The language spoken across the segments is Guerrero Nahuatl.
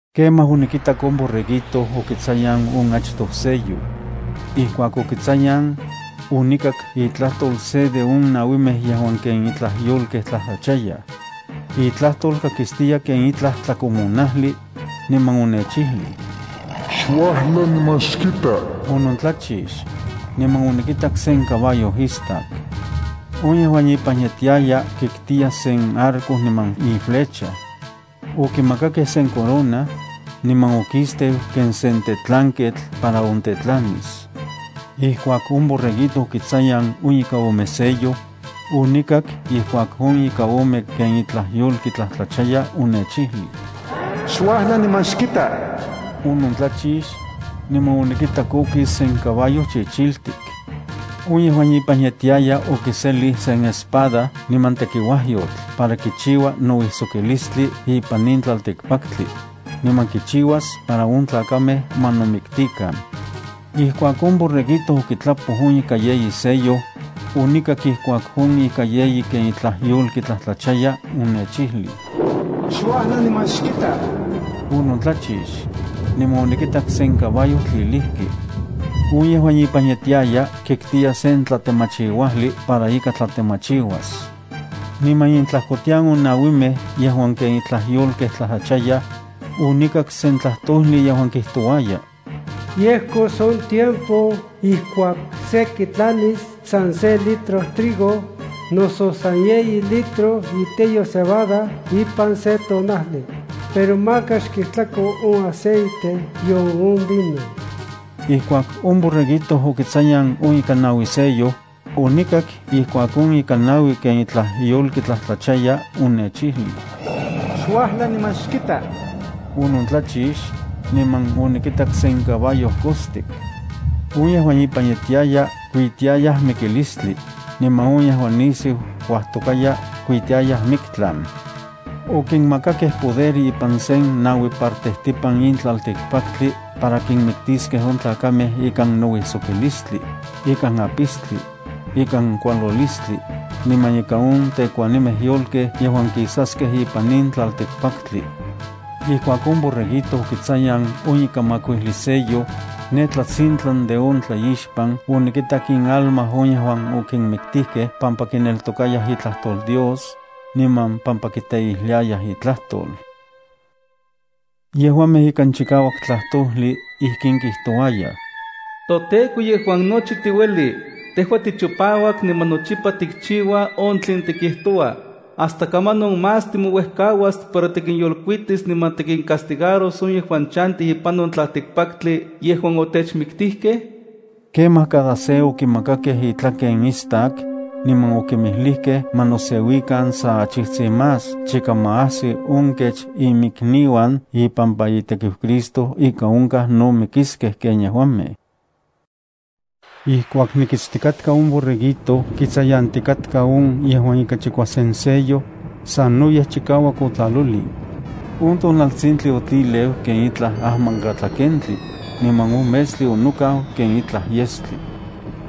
Kemaj onikitak on Borreguito okitsayan on achtoj sello. Ijkuak okitsayan, onikak itlajtol se de on nauimej yejuan ken itlaj yolkej tlajtlachayaj. Itlajtol kakistiya ken itlaj tlakomonajli, niman onechijlij: “¡Xuajla niman xkita!” Onontlachix, niman onikitak sen caballo istak. On yejuan ipan yetiaya kitkiya sen arco niman iflecha. Okimakakej sen corona, niman okisteu ken sen tetlanketl para ontetlanis. Ijkuak on Borreguito okitsayan on ika ome sello, onikak ijkuak on ika ome ken itlaj yolki tlajtlachaya onechijlij: “¡Xuajla niman xkita!” Onontlachix, niman onikitak okis sen caballo chichiltik. On yejuan ipan yetiaya okiselij sen espada niman tekiuajyotl para kichiua nouijsokilistli ipan in tlaltikpaktli, niman kichiuas para on tlakamej ma nomiktikan. Ijkuak on Borreguito okitlapoj on ika yeyi sello, onikak ijkuak on ika yeyi ken itlaj yolki tlajtlachaya onechijlij: “¡Xuajla niman xkita!” Onontlachix, niman onikitak sen caballo tlilijki. On yejuan ipan yetiaya kitkiya sen tlatemachiuajli para ika tlatemachiuas. Niman intlajkotian on nauimej yejuan ken itlaj yolkej tlajtlachayaj, onikak sen tlajtojli yejuan kijtouaya: “Yejkos on tiempo ijkuak se kitlanis san se litro trigo, noso san yeyi litro iteyo cebada ipan se tonajli, pero maka xkijtlako on aceite nion on vino.” Ijkuak on Borreguito okitsayan on ika naui sello, onikak ijkuak on ika naui ken itlaj yolki tlajtlachaya onechijlij: “¡Xuajla niman xkita!” Onontlachix, niman onikitak sen caballo kostik. On yejuan ipan yetiaya kuitiayaj Mikilistli, niman on yejuan nisiu kuajtokaya kuitiayaj Miktlan. Okinmakakej poder ipan sen naui partejtipan in tlaltikpaktli para kinmiktiskej on tlakamej ikan nouijsokilistlis, ikan apistli, ikan kualolistli, niman ikan on tekuanimej yolkej yejuan kisaskej ipan in tlaltikpaktli. Ijkuak on Borreguito okitsayan on ika makuijli sello, ne tlatsintlan de on tlaixpan onikitak inalma on yejuan okinmiktijkej pampa kineltokayaj itlajtol Dios, niman pampa kiteijliayaj itlajtol. Yejuamej ikan chikauak tlajtojli ijkin kijtouayaj: “ToTEKO yejuan nochi tiueli, tejua tichipauak niman nochipa tikchiua on tlen tikijtoua, ¿hasta kamanon más timouejkauas para tikinyolkuitis niman tikincastigaros on yejuan chantij ipan on tlaltikpaktli yejuan otechmiktijkej?” Kemaj cada se okimakakej intlaken istak, niman okinmijlijkej ma noseuikan sa achijtsin más chika ma ajsi on kech iminikniuan ipampa itekiu Cristo ika onkaj no mikiskej ken yejuamej. Ijkuak nikitstikatka on Borreguito kitsayantikatka on yejuan ika chikuasen sello, sanoyej chikauak otlalolin. On tonaltsintli otlileu ken itlaj ajmankatlakentli, niman on metstli onokau ken itlaj yestli.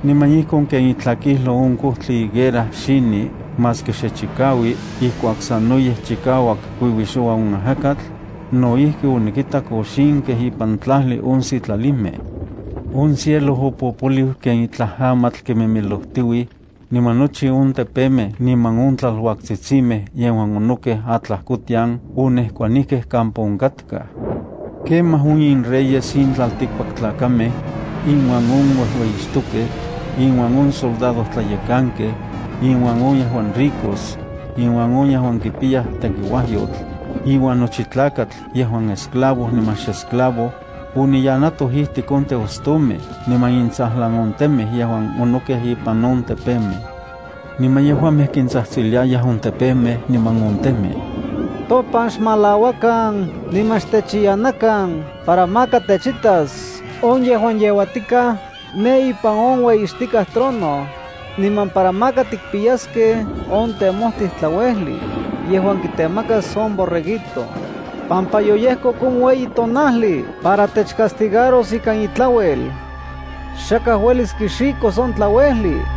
Niman ijkon ken itlakijlo on kojtli higuera xini, maski xe chikaui ijkuak sanoyej chikauak kuiuixoua on ajakatl, no ijki onikitak oxinkej ipan tlajli on sitlalimej. On cielo opopoliu ken itlaj amatl kimimilojtiuij, niman nochi on tepemej niman on tlaluaktsitsimej yejuan onokej atlajkotian onejkuanijkej kampa onkatkaj. Kemaj on inreyes in tlaltikpaktlakamej inuan on uejueyixtokej, inuan on soldadojtlayekankej, inuan on yejuan ricos, inuan on yejuan kipiyaj tekiuajyotl, iuan nochi tlakatl yejuan esclavo, niman xesclavo, oniyanatoj ijtik on teostomej niman intsajlan on temej yejuan onokej ipan on tepemej. Niman yejuamej kintsajtsiliayaj on tepemej niman on temej: “Topan xmalauakan niman xtechiyanakan para maka techitas on yejuan yeuatikaj ne ipan on ueyixtikaj trono, niman para maka tikpiyaskej on temojtij tlauejli, yejuan kitemakas on Borreguito, pampa yoyejkok on ueyi tonajli para techcastigaros ikan intlauel. Xakaj uelis kixikos on tlauejli.”